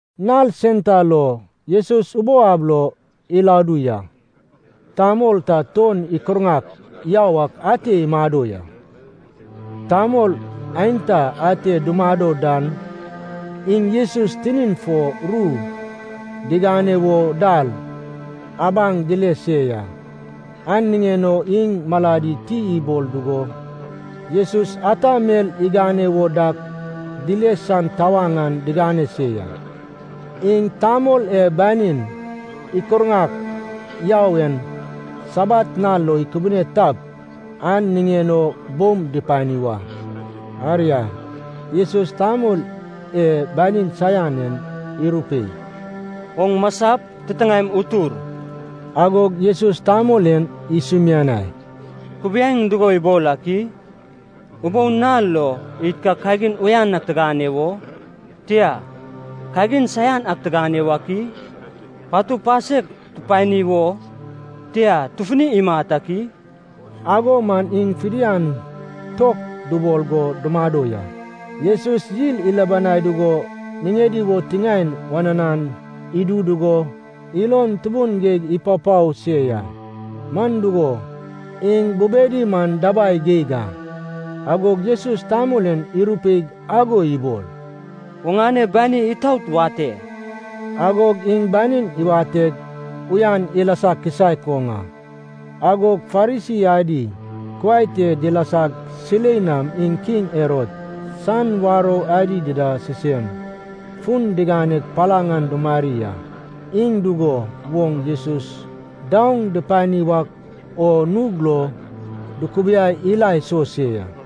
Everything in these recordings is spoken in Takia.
Nal sen ta lo Jesus ubou ab lo iladu ya. Tamol ta tuon ikurŋak yau ak ante imado ya. Tamol aenta ate dumado dan iŋ Jesus tinin fo ru digane wo dal abaŋ dile se ya. An niŋen o iŋ maladi ti ibol dugo Jesus ata mel igane wo dak dile san tawaŋ an digane se ya. Iŋ tamol e banin ikurŋak yau en Sabat nal lo ikubune tap, an niŋen o boum dupani wa. Aria, Jesus tamol e banin saian en irupei, “Oŋ masap, titiŋaem utur.” Agog Jesus tamol en isumianai, “Kubiaeŋ dugo ibol ak i? Ubou nal lo, id ka kagin uyan ak tigane wo? Tia, kagin saian ak tigane wak i? Patu pasek tupani wo? Tia, tufuni imat ak i?” Ago man iŋ fidian tok dubol go dumado ya. Jesus yil ilubanai dugo niŋedi wo tiŋaen wananan idu dugo ilon tubun geig ipapao se ya, man dugo, iŋ bubedi man dabai geig a. Agog Jesus tamol en irupeig ago ibol, “Oŋane bani itaot wate.” Agog iŋ banin iwateg, uyan ilasa kisaek oŋ a. Agog Farisi adi kuai te dilasag silei nam iŋ kiŋ Herod san warou adi dida sisem fun diganeg palaŋ an dumari a. Iŋ dugo woŋ Jesus daoŋ dupani wak o nug lo dukubiai ila iso se ya.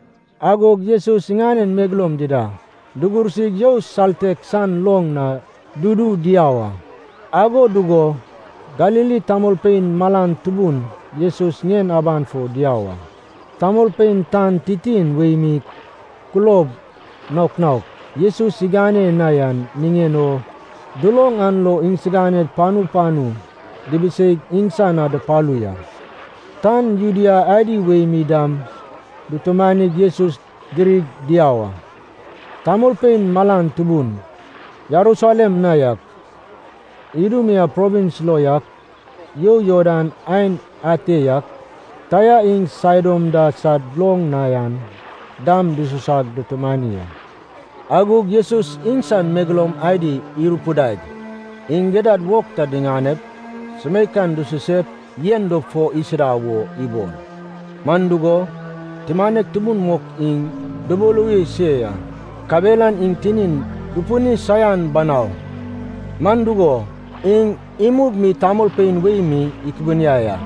Agog Jesus iŋanen megeloum dida dugursig you saltek san loŋ na dudu diau a. Ago dugo Galili tamolpein malan tubun Jesus ŋien aban fo diau a. Tamolpein tan titin wei mi kulob naok naok Jesus igane na yan niŋen o duloŋ an lo iŋsiganed panu panu dibiseig iŋsan na dupalu ya. Tan Judea adi wei mi dam dutumanig Jesus dirig diau a. Tamolpein malan tubun, Jerusalem na yak, Idumea provins lo yak, you Jordan aen ate yak, Taia iŋ Saidon da sad loŋ na yan dam dususag dutumani a. Agog Jesus iŋsan megeloum adi irupidaig, iŋ gidad wog ta diŋanep, sumeikan dususep yen dop fo isuda wo ibol. Man dugo, tumanek tubun mok iŋ dubuluwi se ya, kabelan iŋ tinin dupini saian banau. Man dugo, iŋ imug mi tamolpein wei mi ikubuniai a.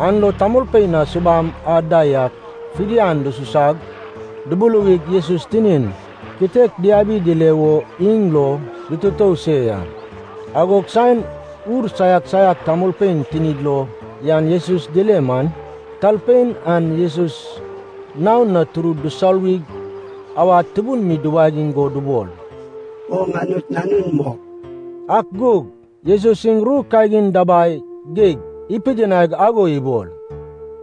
An lo tamolpein a subam ad da yak fidian dususag dubuluwig Jesus tinin kitek diabi dile wo iŋ lo dututou se ya. Agod saen ur saiak saiak talpein tinid lo yan Jesus dile man, talpein an Jesus naon na turud dusoluwig awad tubun mi diwagiŋ go dubol, “Oŋ Anut Nanun mok.” Ak gug Jesus iŋ ru kagin dabai geig ipidinaig ago ibol,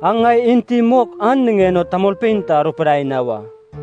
“Aŋ ŋai enti mok an niŋen o tamolpein ta arupidai na wa.”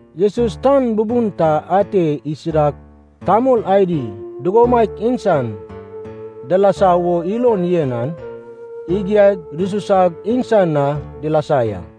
Jesus tan bubun ta ate isidag, tamol adi dugomaiak iŋsan dilasa wo ilon yen an igiaig dususag iŋsan na dilasa ya.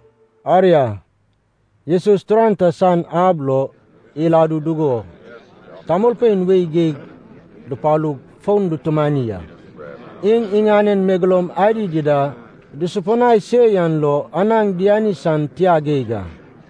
Aria, Jesus turan ta san ab lo iladu dugo tamolpein wei geig dupalug fon dutumani a. Iŋ iŋanen megeloum adi dida dusupinai se yan lo anaŋ diani san tia geig a.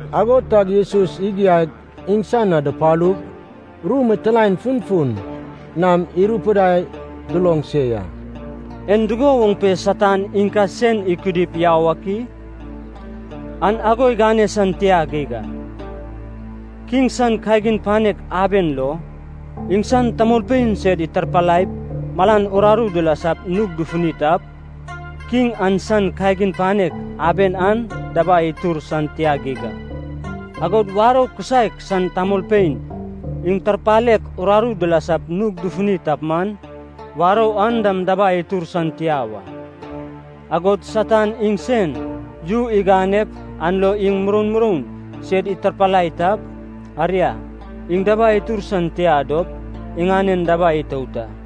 Ago tag Jesus igiaig iŋsan na dupalug ru mitilaen funfun nam irupidai duloŋ se ya. “En dugo woŋ pe Satan iŋ ka sen ikudip yau ak i? An ago igane san tia geig a! Kiŋ san kagin panek aben lo, iŋsan tamolpein sed itarpalaip malan uraru dilasap nug dufuni tap, kiŋ an san kagin panek aben an dabai itur san tia geig a. Agod warou kisaek san tamolpein iŋ tarpalek uraru dilasap nug dufuni tap man, warou an dam dabai itur san tia wa. Agod Satan iŋ sen yu iganep an lo iŋ muroun muroun sed itarpalai tap, aria, iŋ dabai itur san tia dop iŋanen dabai itout a.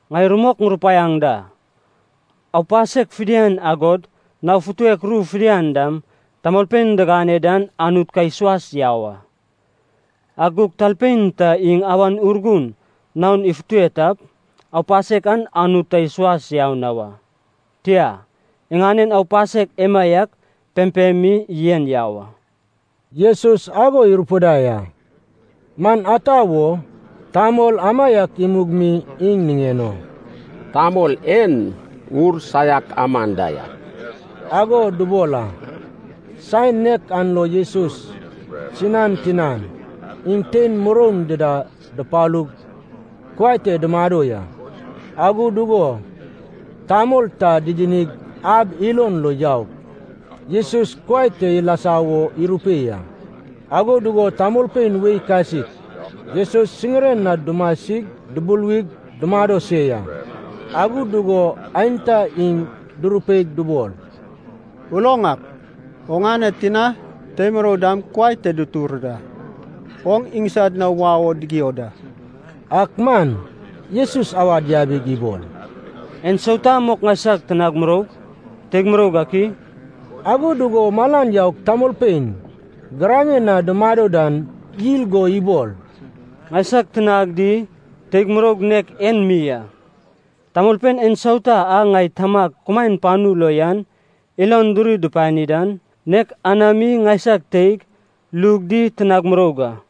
Ŋai rumok ŋurupaiaŋ da, aupasek fidian agod nao futek ru fidian dam tamolpein digane dan Anut ka isuas yau a. Ak gug talpein ta iŋ Awan Urgun naon ifute tap, aupasek an Anut ta isuas yau na wa. Tia, iŋanen aupasek emaiak pempem mi yen yau a.” Jesus ago irupidai a, man ata wo, tamol amaiak imug mi iŋ niŋen o, “Tamol en ur saiak aman da yak,” ago dubol a. Saen nek an lo Jesus sinan tinan iŋ tein muroun dida dupalug kuai te dumado ya. Ago dugo tamol ta didinig ab ilon lo yaup Jesus kuai te ilasa wo irupei a. Ago dugo tamolpein wei kasik Jesus siŋiren na dumasig dubuluwig dumado se ya. Ago dugo aenta iŋ durupeig dubol, “Uloŋ ak, oŋane tina tei murou dam kuai te dutur da, oŋ iŋsad na wau o digio da.” Ak man Jesus awad yabig ibol, “Ensauta mok ŋaisag tinag muroug, teig muroug ak i?” Ago dugo malan yaug tamolpein giraŋen na dumado dan yil go ibol, “Ŋaisag tinag di teig muroug nek en mi a! Tamolpein ensauta a ŋai Tamag kumaen panu lo yan ilon duri dupani dan, nek anami ŋaisag teig, lug di tinag muroug a.”